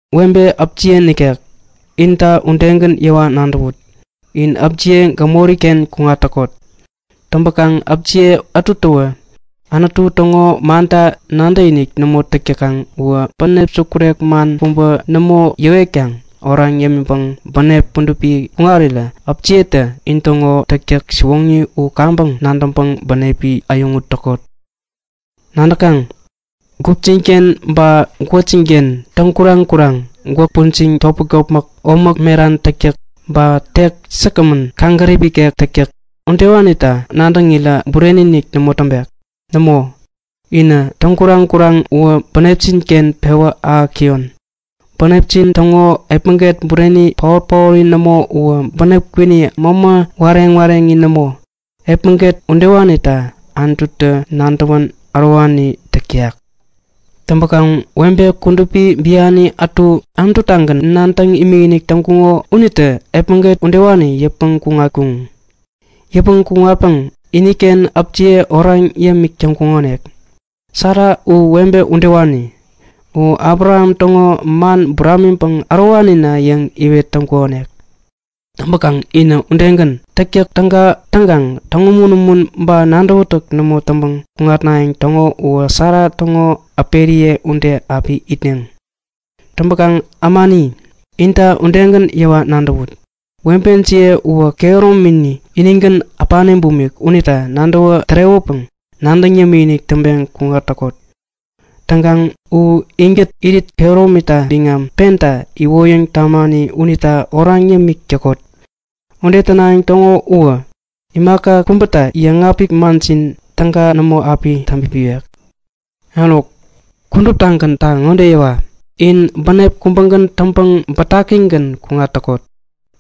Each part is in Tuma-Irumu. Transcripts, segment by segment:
Webe äpjiye nikek, inta udegän yäwa nadäwut. In äpjiye gämori-ken kuŋat täkot. Täŋpäkaŋ äpjiye ätuwä Anutu täŋo manta nadäkinik nämo täk täkaŋ uwä bänep sukurek man kubä nämo yäwetkaŋ oraŋ yämiŋpäŋ bänep kudupi kuŋarirä äpjiyetä intäŋo täktäk siwoŋi u kaŋpäŋ nadäŋkaŋ bänepi äyäŋut täkot. Nadäkaŋ? Gupjin-ken ba gwäkjin-ken täŋkuraŋ-kuraŋ, gwäk pujiŋ topmäk-topmäk, omäk meran täktäk ba tek säkgämän, kaŋgärip ikek täktäk udewanita nadäŋirä bureni-inik nämo täŋpek. Nämo, inä täŋkuraŋ-kuraŋ uwä bänepjin-ken pewä ahäk täyon. Bänepjin täŋo epmäget bureni paot-paori nämo uwä bänep kwini, mämä wareŋ-wareŋi nämo. Epmäget udewanita Anututä nadäwän ärowani täk täyak. Täŋpäkaŋ webe kudupi biani ätu, Anutu-tagän nadäŋ imikinik täŋkuŋo unitä epmäget udewani yäpmäŋ kuŋatkuŋ. Yäpmäŋ kuŋatpäŋ iniken äpiye oraŋ yämik täŋkuŋonik. Sara u webe udewani. U Abraham täŋo man buramiŋpäŋ ärowanina yäŋ iwet täŋkukonik. Täŋpäkaŋ in udegän, täktäk täga täŋkaŋ täŋumun-umun ba nadäwätäk nämo täŋpäŋ kuŋatnayäŋ täŋo uwä Sara täŋo äperiye ude api itneŋ. Täŋpäkaŋ ämani, inta udegän yäwa nadäwut. Webejiye uwä kehäromini inigän äpani bumik unita nadäwä tärewäpäŋ nadäŋ yämikinik täŋpeŋ kuŋat täkot. Täŋkaŋ u inkät irit kehäromita biŋam penta iwoyäŋ tamani unita oraŋ yämik täkot. Ude tänayäŋ täŋo uwä imaka kubätä yäŋapik manjin täga nämo api itpipiwek. Eruk, kuduptagänta ŋode yäwa; In bänep kubägän täŋpäŋ bätakigän kuŋat täkot.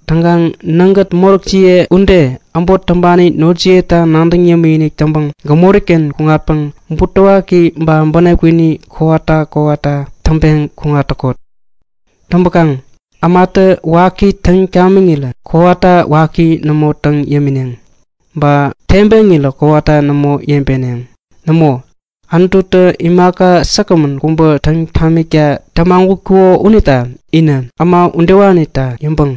Täŋkaŋ nägät moräkjiye ude äbot täŋpani notjiyeta nadäŋ yämikinik täŋpäŋ gämori-ken kuŋatpäŋ butewaki ba bänep kwini kowata kowata täŋpeŋ kuŋat täkot. Täŋpäkaŋ ämatä waki täŋ tamiŋirä kowata waki nämo täŋ yämineŋ. Ba tebeŋirä kowata nämo yebeneŋ. Nämo, Anututä imaka säkgämän kubä täŋ tamikta tämagutkuko unita inä äma udewanita yäŋpäŋ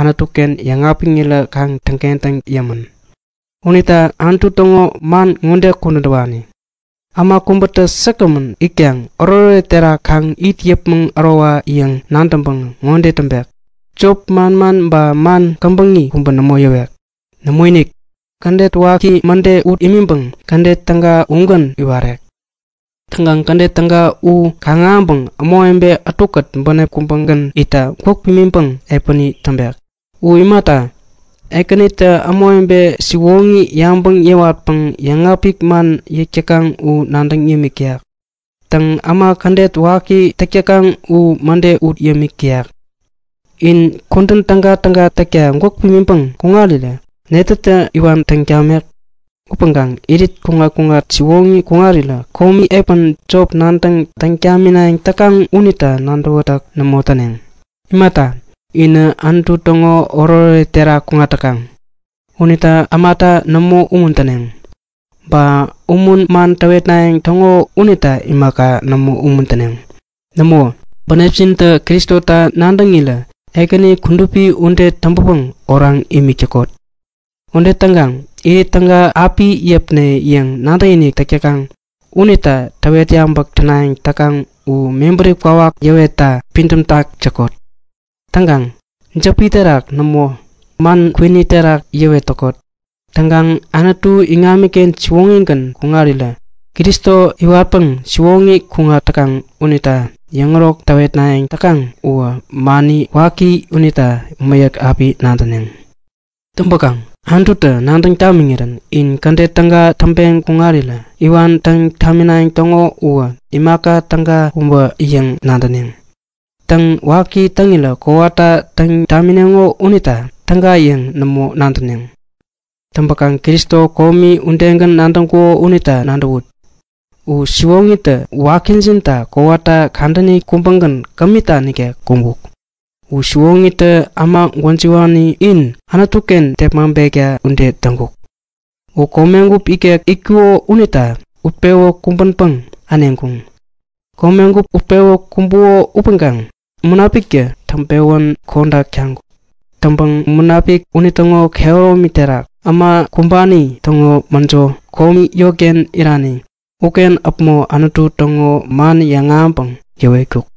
Anutu-ken yäŋapiŋirä kaŋ täŋkentäŋ yämän. Unita Anutu täŋo man ŋode kudän täwani; Äma kubätä säkgämän itkaŋ oretoret terak kaŋ it yäpmäŋ ärowayäŋ nadäŋpäŋä ŋode täŋpek; Jop manman ba man käbäŋi kubä nämo yäwek. Nämoinik! Kädet waki mäde ut imiŋpäŋ kädet täga ugän iwarek. Täŋkaŋ kädet täga u kaŋ-ahäŋpäŋ ämawebe ätukät bänep kubägän itta gwäk pimiŋpäŋ epäni täŋpek. U imata, Ekänitä ämawebe siwoŋi yabäŋ yäwatpäŋ yäŋapik man yäk täkaŋ u nadäŋ yämik täyak. Täŋ, äma kädet waki täk täkaŋ u mäde ut yämik täyak. In kudän tägatäga täkta gwäk pimiŋpäŋ täŋirä netätä iwan täŋ tamek? Täŋpäkaŋ irit kuŋat-kuŋat siwoŋi täŋpeŋ kuŋarirä komi epän jop nadäŋ täŋ taminayäŋ täkaŋ unita nadäwätäk nämo täneŋ. Imata, inä Anutu täŋo oretoret terak kuŋat täkaŋ. Unita ämata nämo umuntäneŋ. Ba umun man täwetnayäŋ täŋo unita imaka, nämo umuntäneŋ. Nämo, bänepjintä Kristota nadäŋirä Ekäni kudupi ude täŋpäpäŋ oraŋ imik täkot. Ude täŋkaŋ Irit täga api yäpne yäŋ nadäkinik täk täkaŋ unita täwet yabäk tänayäŋ täkaŋ u mebäri kwawak yäwetta pidämtak täkot. Täŋkaŋ jäpi terak nämo, man kwini terak yäwet täkot. Täŋkaŋ Anutu iŋamiken siwoŋigän kuŋarirä Kristo iwatpäŋ siwoŋi kuŋat täkaŋ unita yäŋärok täwetnayäŋ täkaŋ uwä mani waki unita mäyäk api nadäneŋ. Täŋpäkaŋ Anututä nadäŋ tamiŋirän in kädet täga täŋpeŋ kuŋarirä iwan täŋ taminayäŋ täŋo uwä imaka täga kubä yäŋ nadäneŋ. Täŋ, waki täŋirä kowata täŋ tamineŋo unita täga yäŋ nämo nadäneŋ. Täŋpäkaŋ Kristo komi udegän nadäŋkuko unita nadäwut. U siwoŋitä wakijinta kowata kadäni kubägän, kämita nikek kumbuk. U siwoŋitä äma gwäjiwani in Anutu-ken tepmaŋpekta ude uwä täŋkuk. U komegup ikek itkuko unita utpewä kumbänpäŋ äneŋkuŋ. Komegup utpewä kumbuko upäŋkaŋ Munapiktä täŋpewän kodak taŋkuk. Täŋpäŋ Munapik unitäŋo kehäromi terak äma kumbani täŋo mäjo, komi yotken irani uken äpmo Anutu täŋo man yäŋahäŋpäŋ yäwetkuk.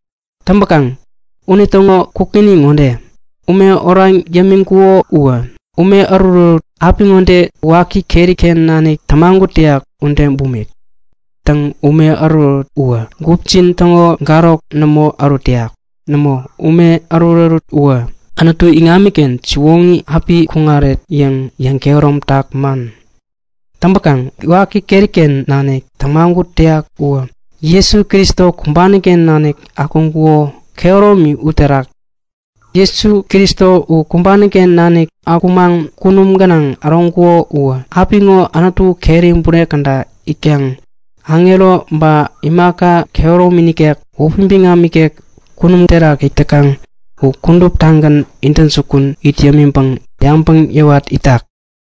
Täŋpäkaŋ unitäŋo kukŋini ŋode; Ume oraŋ yämiŋkuko uwä ume ärutärut apiŋode waki keri-ken nanik tämagut täyak ude bumik. Täŋ, ume ärutärut uwä gupjin täŋo garok nämo ärut täyak. Nämo, ume ärutärut uwä Anutu iŋamiken siwoŋi api kuŋaret yäŋ yäŋkehäromtak man. Täŋpäkaŋ waki keri-ken nanik tämagut täyak uwä Jesu Kristo kumbani-ken nanik akuŋkuko, kehäromi uterak. Jesu Kristo u kumbani-ken nanik akumaŋ kunum gänaŋ äroŋkuko uwä apiŋo Anutu keri bure käda itkaŋ aŋero ba imaka kehäromi nikek, wäpi biŋam ikek kunum terak it täkaŋ u kuduptagän intäjukun it yämiŋpäŋ yabäŋ yäwat itak.